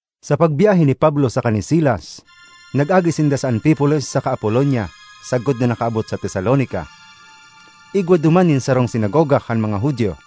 Sa pagbyahe ni Pablo saka ni Silas, nag-agi sinda sa Anfipolis saka Apolonia, sagkod na nakaabot sa Tesalonica. Igwa duman nin sarong sinagoga kan mga Judio.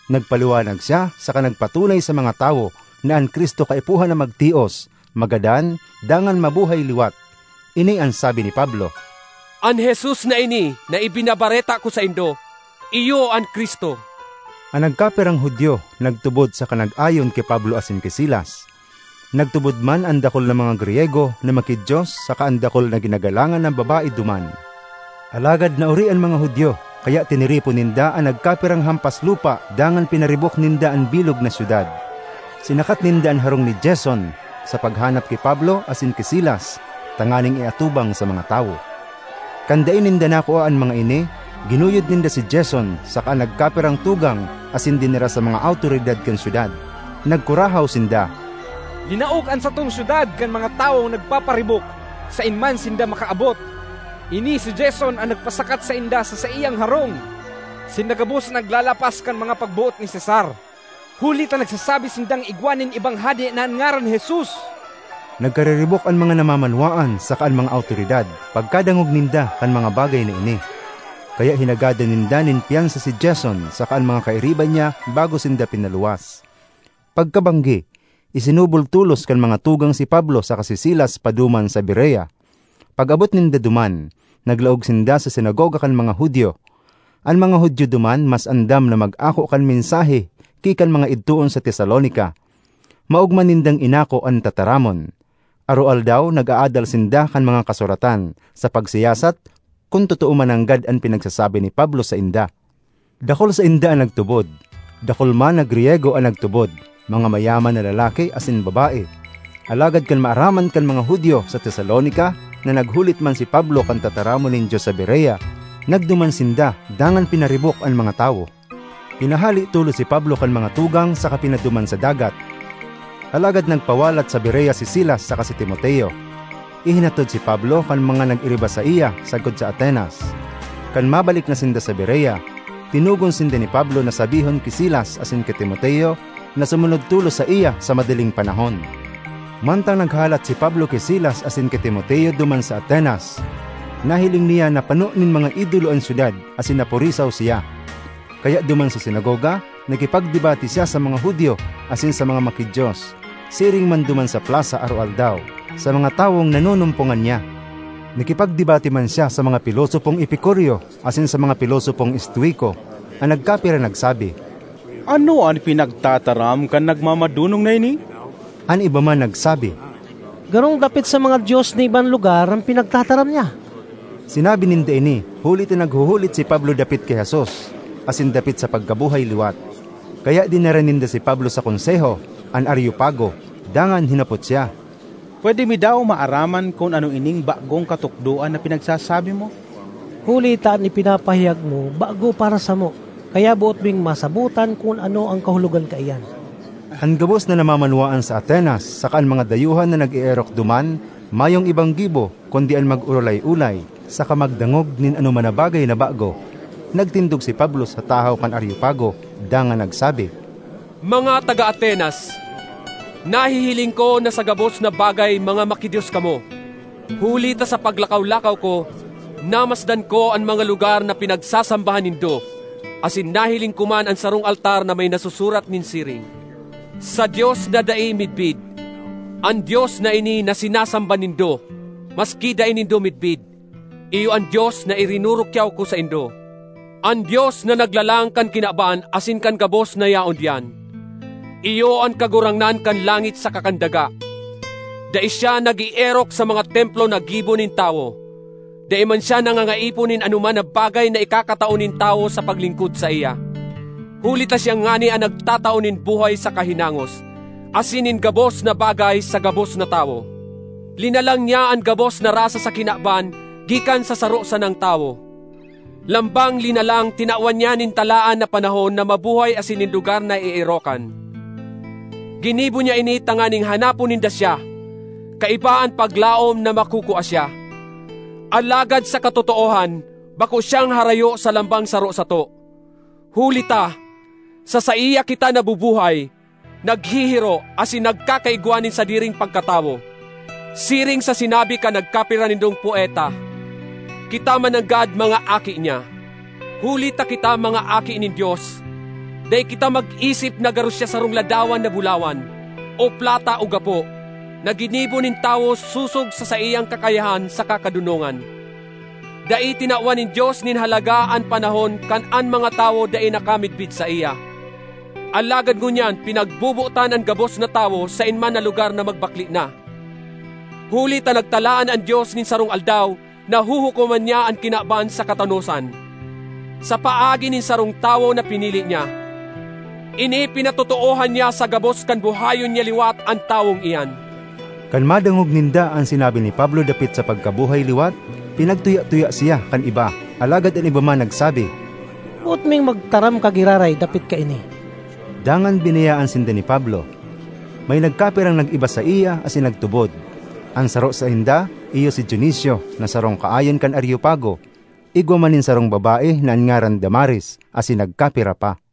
Nagpaliwanag siya saka nagpatunay sa mga tawo na an Cristo kaipuhan na magtios, magadan, dangan mabuhay liwat. Ini an sabi ni Pablo, “An Jesus na ini na ibinabareta ko saindo, iyo an Cristo.” An nagkapirang Judio nagtubod saka nag-ayon ki Pablo asin ki Silas. Nagtubod man an dakul na mga Griyego na maki-Dios saka an dakul na ginagalangan na babae duman. Alagad naori an mga Judio, kaya tiniripon ninda an nagkapirang hampaslupa dangan pinaribok ninda an bilog na syudad. Sinakat ninda an harong ni Jason sa paghanap ki Pablo asin ki Silas tanganing iatubang sa mga tawo. Kan dai ninda nakua an mga ini, ginuyod ninda si Jason saka an nagkapirang tugang asin dinara sa mga awtoridad kan syudad. Nagkurahaw sinda, “Linaog an satong syudad kan mga tawong nagpaparibok saen man sinda makaabot; ini si Jason an nagpasakat sainda sa saiyang harong. Sinda gabos naglalapas kan mga pagboot ni Cesar huli ta nagsasabi sindang igwa nin ibang hade na an ngaran Jesus.” Nagkariribok an mga namamanwaan saka an mga awtoridad pagkadangog ninda kan mga bagay na ini. Kaya hinagadan ninda nin pyansa si Jason saka an mga kairiba niya bago sinda pinaluwas. Pagkabanggi, isinubol tolos kan mga tugang si Pablo saka si Silas paduman sa Berea. Pag-abot ninda duman, naglaog sinda sa sinagoga kan mga Judio. An mga Judio duman mas andam na mag-ako kan mensahe ki kan mga idtoon sa Tesalonica. Maogma nindang inako an tataramon; aroaldaw nag-aadal sinda kan mga Kasuratan sa pagsiyasat kun totoo mananggad an pinagsasabi ni Pablo sainda. Dakul sainda an nagtubod; dakul man na Griyego an nagtubod—mga mayaman na lalaki asin babae. Alagad kan maaraman kan mga Judio sa Tesalonica na naghulit man si Pablo kan tataramon nin Dios sa Berea, nagduman sinda dangan pinaribok an mga tawo. Pinahale tolos si Pablo kan mga tugang saka pinaduman sa dagat; alagad nagpawalat sa Berea si Silas saka si Timoteo. Ihinatod si Pablo kan mga nag-iriba saiya sagkod sa Atenas. Kan mabalik na sinda sa Berea, tinugon sinda ni Pablo na sabihon ki Silas asin ki Timoteo na sumunod tolos saiya sa madaling panahon. Mantang naghahalat si Pablo ki Silas asin ki Timoteo duman sa Atenas, nahiling niya na pano nin mga idolo an syudad asin napurisaw siya. Kaya duman sa sinagoga, nakipagdebate siya sa mga Judio asin sa mga maki-Dios; siring man duman sa plasa aroaldaw, sa mga tawong nanunumpongan niya. Nakipagdebate man siya sa mga pilosopong Epicureo asin sa mga pilosopong Estoico. An nagkapira nagsabi, “Ano an pinagtataram kan nagmamadonong na ini?” An iba man nagsabi, “Garong dapit sa mga dios nin ibang lugar an pinagtataram niya.” Sinabi ninda ini huli ta naghuhulit si Pablo dapit ki Jesus asin dapit sa pagkabuhay liwat. Kaya dinara ninda si Pablo sa Konseho, an Areopago, dangan hinapot siya, “Pwede mi daw maaraman kun ano ining bagong katukdoan na pinagsasabi mo? Huli ta an ipinapahayag mo bago para samo, kaya boot ming masabotan kun ano an kahulogan kaiyan.” (An gabos na namamanwaan sa Atenas saka an mga dayuhan na nag-eerok duman mayong ibang gibo kundi an mag-orolay-olay saka magdangog nin anoman na bagay na bago.) Nagtindog si Pablo sa tahaw kan Areopago dangan nagsabi, “Mga taga Atenas, nahihiling ko na sa gabos na bagay mga maki-Dios kamo. Huli ta sa paglakaw-lakaw ko, namasdan ko an mga lugar na pinagsasambahan nindo asin nahiling ko man an sarong altar na may nasusurat nin siring, ‘Sa Dios na Dai Midbid.’ An Dios na ini na sinasamba nindo maski dai nindo midbid, iyo an Dios na irinurukyaw ko saindo. An Dios na naglalang kan kinaban asin kan gabos na yaon diyan, iyo an Kagurangnan kan langit saka kan daga. Dai siya nag-eerok sa mga templo na gibo nin tawo. Dai man siya nangangaipo nin anoman na bagay na ikakatao nin tawo sa paglingkod saiya, huli ta siya ngani an nagtatao nin buhay saka hinangos, asin nin gabos na bagay sa gabos na tawo. Linalang niya an gabos na rasa sa kinaban gikan sa saro sanang tawo. Lambang linalang tinawan niya nin talaan na panahon na mabuhay asin nin lugar na eerokan. Ginibo niya ini tanganing hanapon ninda siya, kaiba an paglaom na makukua siya. Alagad sa katotoohan bako siyang harayo sa lambang saro sato, huli ta, ‘Sa saiya kita nabubuhay, naghihiro, asin nagkakaigwa nin sadiring pagkatawo;’ siring sa sinabi kan nagkapira nindong poeta, ‘Kita mananggad mga aki niya.’ Huli ta kita mga aki nin Dios, dai kita mag-isip na garo siya sarong ladawan na bulawan o plata o gapo, na ginibo nin tawo sosog sa saiyang kakayahan saka kadonongan. Dai tinawan nin Dios nin halaga an panahon kan an mga tawo dai nakamidbid saiya, alagad ngunyan pinagbobotan an gabos na tawo saen man na lugar na magbakle na. Huli ta nagtalaan an Dios nin sarong aldaw na huhukoman niya an kinaban sa katanosan, sa paagi nin sarong tawo na pinili niya. Ini pinatotoohan niya sa gabos kan buhayon niya liwat an tawong iyan!” Kan madangog ninda an sinabi ni Pablo dapit sa pagkabuhay liwat, pinagtuya-tuya siya kan iba, alagad an iba man nagsabi, “Boot ming magtaram ka giraray dapit kaini.” Dangan binayaan sinda ni Pablo. May nagkapirang nag-iba saiya asin nagtubod; an saro sainda iyo si Dionisio na sarong kaayon kan Areopago; igwa man nin sarong babae na an ngaran Damaris, asin nagkapira pa.